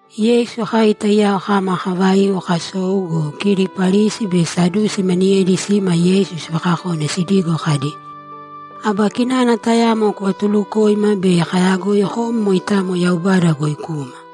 Yeisu kai taiyao kama kavaiu kasou go, kidi Parisi be Sadusi maniyedi sima Yeisu sivakakone sidigo kadi, ‘Aba kinana tayamo kuvatulukōima bei kayagoi kom moitamo Yaubada goi kuma.’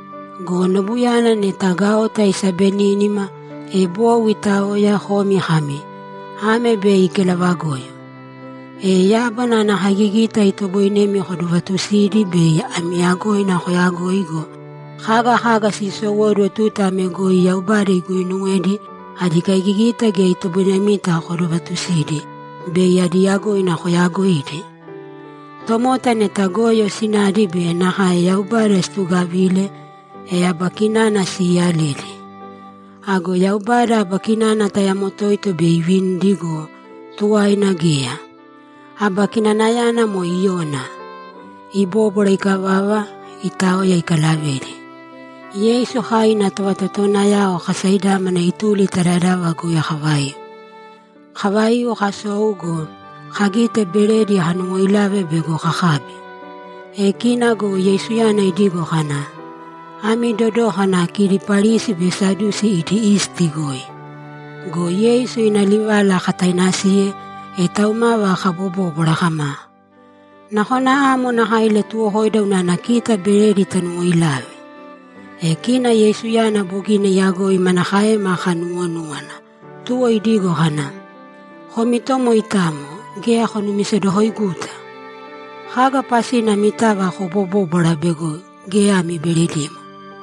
Go nobuyana neta gaota isabenínima, e bou itaoya, komi kami, “Ame bei kelavagoyo.” E yábana ana kaigigita itoboinemi kodovatusidi bei ana yagoina koyagoi go, kaga kaga sisowóduwo tuta ame goi Yaubada iguuinuwedi adi kaigigita geya itoboinemita kodovatusidi bei adi yagoina koyagoidi! Tomota neta goyo sinadi be nakae Yaubada situgavile, e aba kinana siiyaledi. Ago Yaubada aba kinana tayamo toito bei ivinidi go, tuwaina geya. Aba kinanayana moe Iyona.’ Ibóbwara ikavava, itaoya ikalavedi. Yeisu kai ina tovatotowanayao kasaidámana ituli ta dadava goi kavaiu. Kavaiu, kasou go, kagite beredi kanuwoilave bego kakabi. E kina go Yeisuyana idigo kana, ‘Ami dodōkana kidi Parisi be Sadusi idi isti goi.’ Go Yeisu ina livala katainasiye, e taumava kabobóbwara kama, ‘Nakona amo nakae ilatuwokoida unana kita beredi tanuwoilave.’ E kina Yeisuyana bogina iyagoi manakaema kanuwonúwana, tuwo idigo kana, ‘Komi to moitamo, geya konumisedokoiguta! Kaga pasina amitava kobobóbwara bego geya ami beredimo?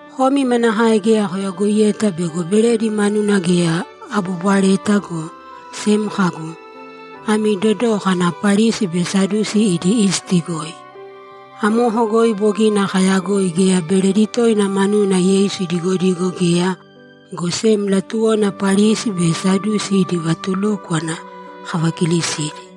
Komi manakae geya koyagoiyeta bego beredi manuna geya abobwareta, go sem kagu, “Ami dodōkana Parisi be Sadusi idi isti goi.”’ Amoko goi bogina kayagoi geya beredi toina manuna Yeisu idigodigo geya, go sem latuwona Parisi be Sadusi idi vatulúkwana kavakilisidi.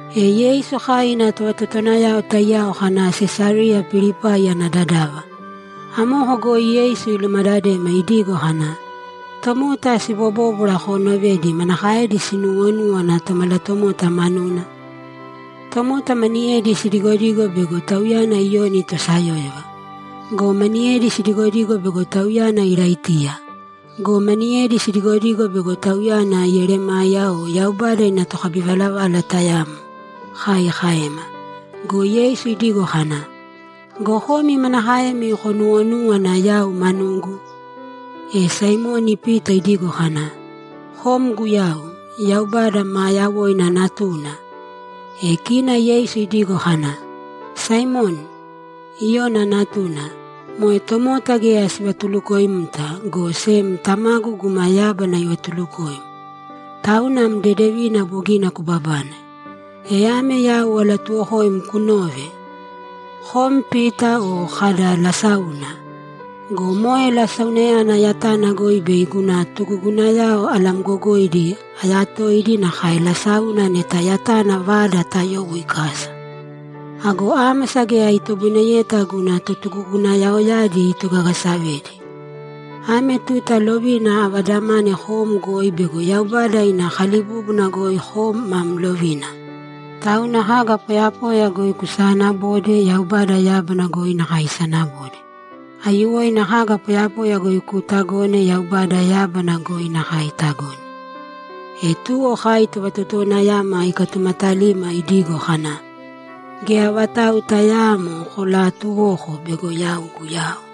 E Yeisu kai ina tovatotowanayao taiyao kana Sesariya Pilipai ana dadava. Amoko goi Yeisu ilumadadema idigo kana, ‘Tomota sibobóbwara koonovedi manakaedi sinuuwonúwana Tomalatomota manuna?’ ‘Tomota maniyedi sidigodigo bego Tauyana Iyoni tosayóyova. Go maniyedi sidigodigo bego Tauyana Iraitiya. Go maniyedi sidigodigo bego Tauyana Yeremaya o Yaubada ina tokabivalavala tayamo’, kai kaema. Go Yeisu idigo kana, ‘Go komi manakaemi konuwonúwana yau manugu?’ E Saimoni Pita idigo kana, ‘Kom Guyau, Yaubada maa yawoina Natuna!’ E kina Yeisu idigo kana, ‘Saimoni, Iyona natuna, moe tomota geya sivatulukoimta, go sem Tamagu guma yábana ivatulukoim. Tauna am dedevina bogina kubabane. E ame yau alatuuwokoim kunōve: Kom Pita o kada, “Lasáuna.” Go moe lasaunayana yatana goi bei yau guna totugugunayao alamgogoidi ayatoidi nakae lasáuna neta yatana vada tayowo ikasa. Ago ámasa geya itoboineyeta guna totugugunayaoyadi itogagasavedi. Ame tuta lovina avadamane kom goi bego Yaubada ina kalibúbuna goi kom mam lovina. Tauna kaga poyapoya goi kusaanabode Yaubada yábana goi nakae isanabode. Aiyuwoina kaga poyapoya goi kuutagone Yaubada yábana goi nakae itagone.’ E tuwo kai tovatotowanayama ikatumatalima idigo kana, ‘Geya vatau tayaamo kolaatuwōko bego yau Guyau.’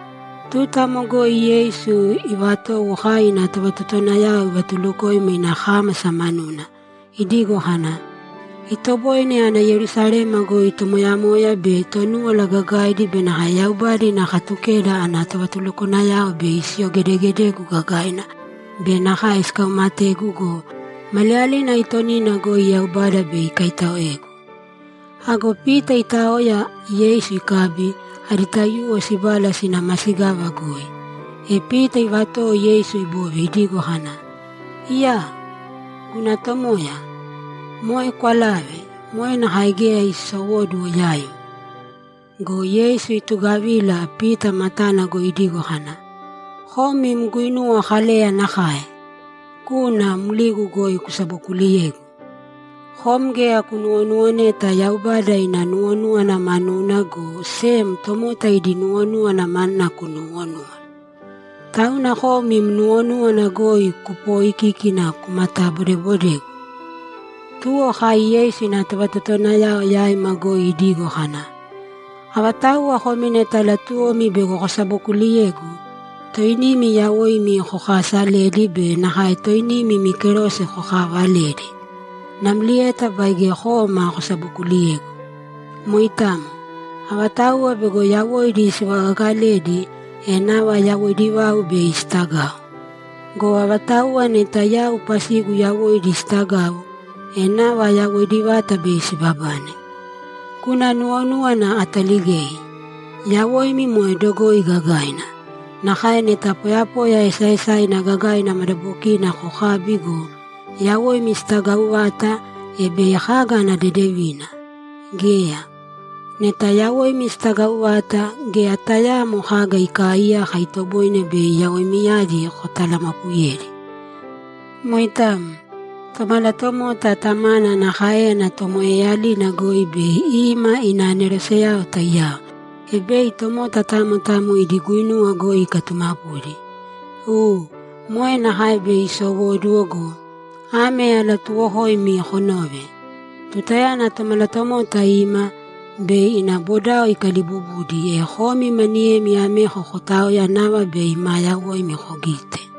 Tuta amo goi Yeisu ivatowo kai ina tovatotowanayao ivatulukoima ina kámasa manuna, idigo kana, ‘Itoboine ana Yerusalema goi tomoyamoya be Tonúwala Gagaidi be nakae Yaubada ina Katukeda ana tovatulukwanayao bei siyogedegedegu gagaina be nakae sikaumategu go, maliyalina aitonina goi Yaubada bei ikaitaoegu.’ Ago Pita itaoya Yeisu ikabi, adi taiyuwo sibala sina masigava goi, e Pita ivatowo Yeisu ibove idigo kana, ‘Iyaa! Guna Tomoya, moe kwalāve! Moe nakae geya iisowóduwo yaim!’ Go Yeisu itugavila, Pita matana goi idigo kana, ‘Kom im guinuwa Kaleya nakae! Kūna mligu goi kusabokuliyēgu! Kom geya kunuwonuwoneta Yaubada ina nuwonúwana manuna, go sem tomota idi nuwonúwana manuna kunuwonúwana. Tauna kom im nuwonúwana goi kupooikíkina kumatabodeebodegu!’ Tuwo kai Yeisu ina tovatotowanayao yaima goi idigo kana, ‘Avatauwa komi neta latuwomi bego kosabokuuliyegu, toinimi yawoimi kokaasalēdi be nakae toinimi imi kerose kokaavalēdi namlieta baige kōma kosabokuliyēgu. Moitamo. Avatauwa bego yawoidi sivagagaledi, e nava yawoidi vau bei sitagau. Go avatauwa neta yau pasigu yawoidi sitagau, e nava yawoidi vata bei sibabane. Guna nuwonúwana ataligei. Yawoimi moe dogoi gagaina. Nakae neta poyapoya esaesaina gagaina madabokina kokabi go, yawoimi sitagau vata, e bei kaga ana dedevina? Geya. Neta yawoimi sitagau vata, geya tayaamo kaga ikaaiyaka itoboine bei yawoimiyadi kotalamapuyedi. Moitamo. Tomalatomota Tamana ana káeyana tomoeeyalina goi bei ima ina aneroseyao taiyao, e bei tomota tamo tamo idi guinuwa goi ikatumapudi. U, moe nakae bei isowóduwo go, ame alatuuwokoimi konōve: Tutayana Tomalatomota ima, bei ina bodao ikaliibubudi, e komi maniyemi ameko kootaoya nava bei maa yawoimi kogite.’